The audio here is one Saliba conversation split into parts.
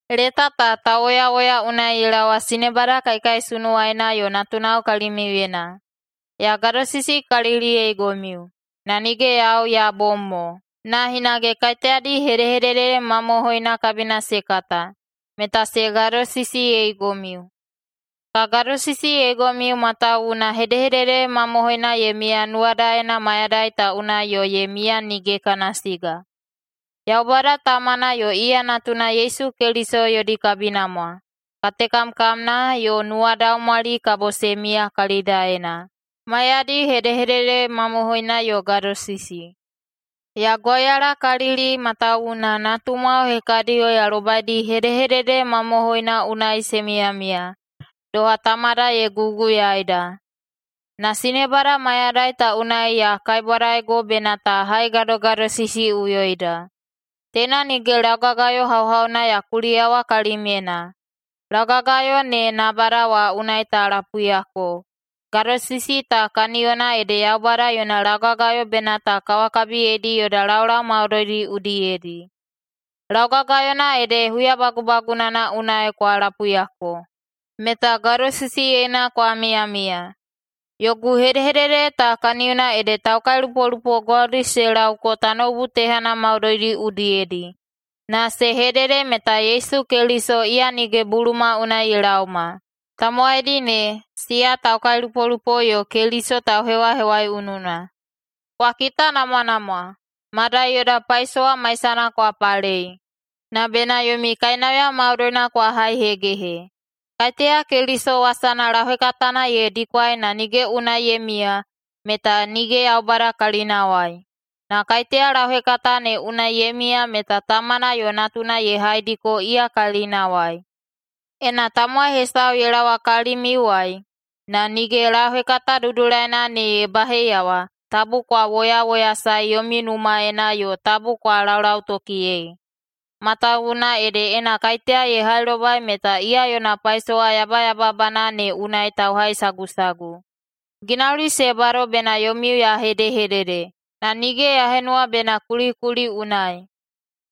Leta ta tauwoyawoya unai ye laowa sinebada kaikaisunuwaina yo natunao kalimiuyena. Ya gadosisikaliliyeigomiu, na nige yau ya bom mo, na hinage kaiteyadi hedehedede mamohoina kabina se kata, meta se gadosisiyeigomiu. Ka gadosisiyeigomiu matawuwuna hedehedede mamohoina ye miya nuwadaena mayadai ta unai yo ye miya nige kana siga. Yaubada Tamana yo iya Natuna Yesu Keliso yodi kabinamwa, katekamkamna, yo nuwadaumwali kabo se miya kalidaena, maiyadi hedehedede mamohoina yo gadosisi. Ya gwauyalakalili matawuwuna natumwao hekadiyo ya lobaidi hedehedede mamohoina unai se miyamiya, doha Tamada ye guguyaida. Na sinebada, mayadai ta unai ya kaibwadaigo bena ta haigadogadosisiꞌuyoida. Teina nige laugagayo hauhauna ya kuliyawa kalimyena. Laugagayona ne nabada wa unai ta lapuiyako. Gadosisi ta kaniyona ede Yaubada yona laugagayo bena ta kawakabiyeidi yoda laulau maudoidi udiyedi. Laugagayona ede huya bagubagunana unai kwa lapuiyako, meta gadosisiyena kwa miyamiya. Yogu hedehedede ta kaniyona ede taukailupolupo gwaudi se laoko tanoubu tehana maudoidi udiyedi, na se hedede meta Yesu Keliso iya nige buluma unai ye laoma. Tamowaidi ne, siya taukailupolupo yo Keliso tauhewahewaiununa. Kwa kitanamwanamwa, madai yoda paisowa maisana kwa palei, na bena yomi kainauya maudoina kwa haihegehe. Kaiteya Keliso wasana lauhekatana ye dikwai na nige unai ye miya, meta nige Yaubada kalinawai. Na kaiteya lauhekata ne unai ye miya meta Tamana yo Natuna ye haidiko iya kalinawai. Ena tamowai hesau ye laowa kalimiuwai, na nige lauhekata dudulaina ne ye baheiyawa, tabu kwa woyawoyasaei yomi numaena yo tabu kwa laulautokiyei. Matawuwuna ede ena kaiteya ye hailobai meta iya yona paisowa yabayababana ne unai tauhaisagusagu. Ginauli se bado bena yomiu ya hedehedede, na nige ya henuwa bena kulikuli unai.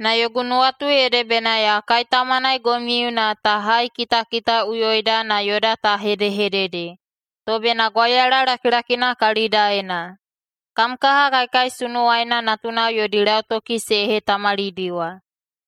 Na yogu nuwatu ede bena ya kaitaumanaigomiu na ta haikitakitaꞌuyoida na yoda ta hedehedede, to bena gwauyala lakilakina kalidaena. Kam kaha kaikaisunuwaina natunao yodi lautoki se hetamalidiwa.